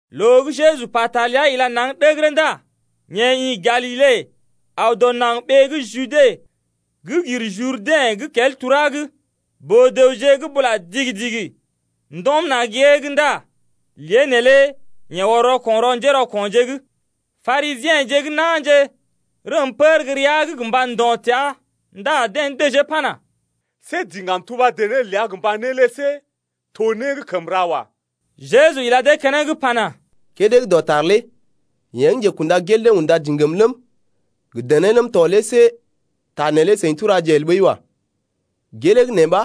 Loo gə́ Jeju pata ləa ila naŋg ɗəgərə ndá yeḛ ḭ Galile aw dɔ naŋg ɓee gə́ Jude gə́ gir Jurdɛ̰ gə́ kel tura’g. Boo-dəwje gə́ bula digi-digi ndɔm na̰ gée’g ndá lée neelé yeḛ ɔr rɔko̰ rɔ njérɔko̰je’g. Parisiḛje gə́ na̰je rəm pər gə́ rəa’g gə mba ndo̰ təa ndá deḛ dəjee pana: See diŋgam tuba dené ləa gə mba né lé see to né gə́ kəm ra wa. Jeju ila dee keneŋ pana: Kédé gə́ dɔtar lé yeḛ gə́ njekunda gel dee unda diŋgam ləm, gə dené ləm tɔ lé see ta neelé seḭ turaje el ɓəi wa. Gelee gə́ nee ɓa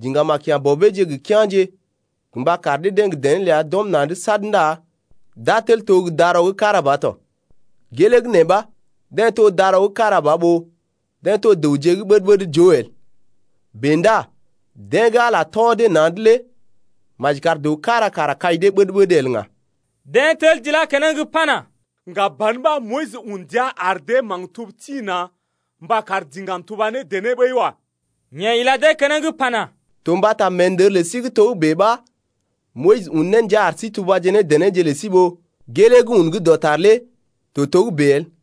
diŋgam a kya̰ bɔbeeje gə kea̰je gə mba kar dee-deḛ gə dené ləa d’ɔm na̰’d sad ndá d’a tel to gə́ darɔ gə́ kára ba tɔ. Gelee gə́ nee ɓa deḛ to darɔ gə́ kára ba ɓó deḛ to dəwje gə́ ɓəd-ɓəd joo el. Bèe ndá deḛ gə́ Ala tɔ dee na̰’d lé maji kar dəw kára kara kai dee ɓəd-ɓəd el ŋga. Deḛ tel d’ilá keneŋ pana: Ŋga ban ɓa Moyis un ndia ar dee maktub tḭ-na̰ mba kar diŋgam tuba ne dené ɓəi wa. Yeḛ ila dee keneŋ pana: To mbata meendər lə sí gə́ togə́bè ɓa Moyis un ne ndia ar sí tubaje ne denéje lə sí ɓó gelee gə́ un gə́ dɔtar lé to togə́bè el.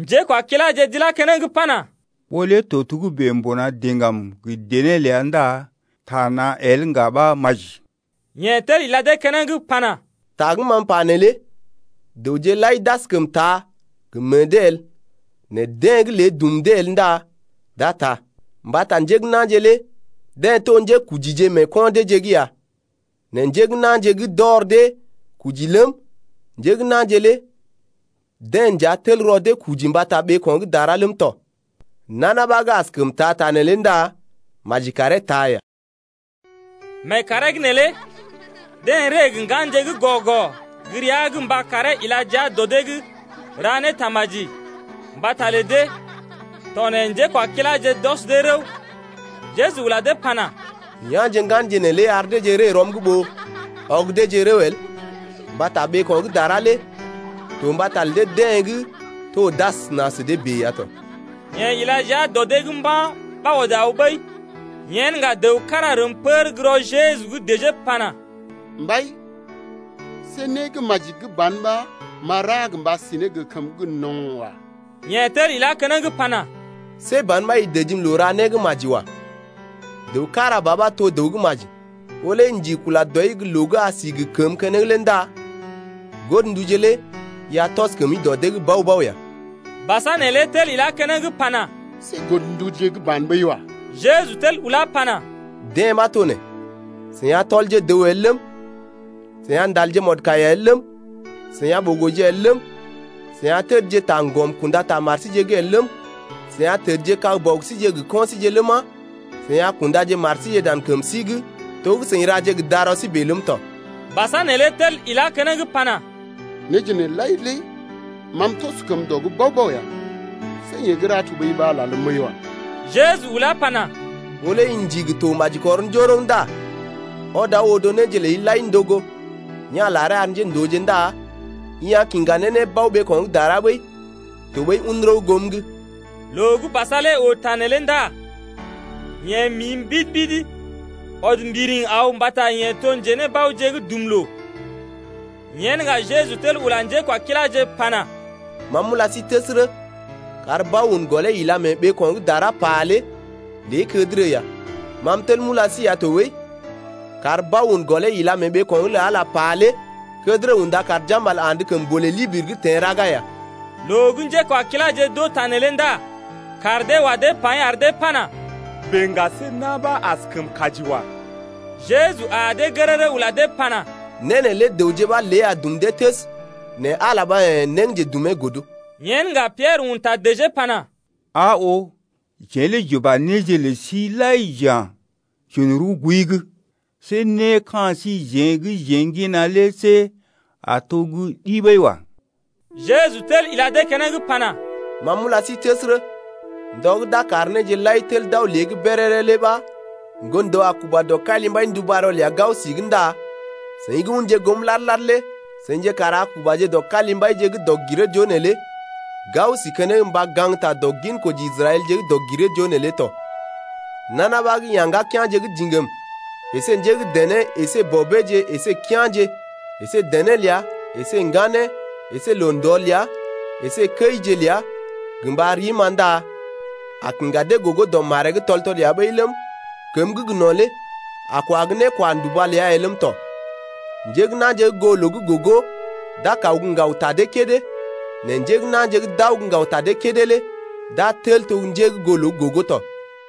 Njékwakiláje d’ilá keneŋ pana: Ɓó lé to togə́bè mbuna diŋgam gə dené ləa ndá taa na̰ el ŋga ɓa maji. Yeḛ tel ila dee keneŋ pana: Ta gə́ ma m’pa neelé dəwje lai d’askəm taa gə meḛ dee el nɛ deḛ gə́ lée dum dee el ndá d’a taa ya. Mbata njé gə́ na̰je lé deḛ to njékujije mee ko̰ deeje’g ya, nɛ njé gə́ na̰je gə́ d’ɔr dee kuji ləm, njé gə́ na̰je lé deḛ nja tel rɔ dee kuji mbata ɓeeko̰ gə́ dara ləm tɔ. Nana ɓa gə́ askəm taa ta neelé ndá maji karee taa ya. Mee kàree’g neelé deḛ ree gə ŋganje gə́ gɔ-gɔ gə́ rəa’g mba karee ila jia dɔ dee’g ra ne tamaji mbata lə dee tɔ nɛ njékwakiláje d’ɔs dee rəw, Jeju ula dee pana: Ya̰je ŋganje neelé ar deeje ree rɔm’g ɓó ɔg deeje rəw el, mbata ɓeeko̰ gə́ dara lé to mbata lə deḛ gə́ to d’asəna sə dee bèe ya tɔ. Yeḛ ila jia dɔ dee’g mba̰ ɓa ɔd aw ɓəi. Yen ŋga dəw kára rəm pər gə́ rɔ Jeju’g dəjee pana: Mbai, see né gə́ maji gə́ ban ɓa m’a ra gə mba si ne gə kəmə gə́ gə no̰ lé wa. Yeḛ tel ilá keneŋ pana: See ban ɓa i dəjim loo néra gə́ maji wa. Dəw kára ba ɓa to dəw gə́ maji. Ɓó lé i ndigi kula dɔi gə́ loo gə́ a si gə kəmə keneŋ lé ndá godnduje lé i a tɔs kəmi dɔ dee’g bao-bao ya. Basa neelé tel ilá keneŋ pana: See godnduje gə́ ban ɓəi wa. Jeju tel ulá pana: Dee ɓa to nee: I a tɔl dəw el ləm, i a ndal mɔdkaiya el ləm, i a ɓogo el ləm, i a təd taŋgɔm kunda ta mari’g el ləm 9i a tədkag bɔbije gə kɔinje ləma, i a kunda mari dan kəmi’g to gə́ i ra ne gə darɔi bèe ləm tɔ. Basa neelé tel ilá keneŋ pana: Néje nee lai lé ma m’tɔs kəm dɔ’g bao-bao ya. Yee gə́ ra tɔɓəi ɓa lalm ɓəi wa. Jeju ulá pana: Ɓó lé i ndigi to maji kɔr njoroŋ ndá ɔd aw odo néje ləi lai ndogo, ya̰ laree ar njéndooje ndá i a kiŋga ne nébao ɓeeko̰ gə́ dara ɓəi, tɔɓəi un rəw goom’g. Loo gə́ basa lé oo ta neelé ndá yeḛ mi mbidi-mbidi ɔd mbiriŋ aw mbata yeḛ to njenébaoje gə́ dum dɔ loo. Yen ŋga Jeju tel ula njékwakiláje pana: Ma m’ula sí təsərə, kar bao un gɔlee ila mee ɓeeko̰ gə́ dara pà lé kədərə ya. Ma m’tel m’ula sí ya tɔɓəi, kar bao un gɔlee ila mee ɓeeko̰’g lə Ala pà lé kədərə unda kar jambal andə kəmbolè libiri’g teḛ raga ya. Loo gə́ njékwakiláje d’oo ta neelé ndá kaar dee wa dee paḭ ar dee pana: Bèe ŋga see na̰ ɓa askəm kaji wa. Jeju aa dee gərərə ula dee pana: Né neelé dəwje ɓa lée a dum dee təs nɛ Ala ɓa yḛ̀ né gə́ njedumee godo. Yen ŋga Piɛrə un ta dəjee pana: Aa oo, jeḛ lé j’uba néje lə sí lai j’ya̰ j’un rəw gooi’g. See né ka̰ síjeḛ gə́ jeḛ ŋgina lé see a to gə́ ɗi ɓəi wa. Jeju tel ila dee keneŋ pana: Ma m’ula sí təsərə, ndɔ gə́ d’a gə kar néje lai tel to lée’g béréré lé ɓa Ŋgon-dəw a kuba dɔ kalimbai ndubarɔ ləa gao si’g ndá seḭ gə́ unje goom lad-lad lé seḭje kara a kubaje dɔ kalimbaije gə́ dɔg-giree-joo neelé gao si keneŋ mba gaŋgta dɔ ginkoji Israɛlje gə́ dɔg-giree-joo neelé tɔ. Nana ɓa gə́ ya̰ ŋgakea̰je gə diŋgam əsé njé gə́ dené əsé bɔbeeje əsé kea̰je əsé dené ləa əsé ŋganeeje əsé loo-ndɔ ləa əsé kəije ləa gə mba rim-ma ndá a kiŋga dee gogo dɔ maree’g loo tɔl-tɔl ya ɓəi ləm, kəmə gə́ gə no̰ lé a kwa gə́ nékwanduba ləa ya ləm tɔ. Njé gə́ na̰je gə́ goo loo gə́ gogo d’a kaw gə́ ŋgaw ta dee kédé, nɛ njé gə́ na̰je gə́ d’aw gə́ ŋgaw ta dee kédé lé d’a tel to njé gə́ goo loo gə́ gogo tɔ.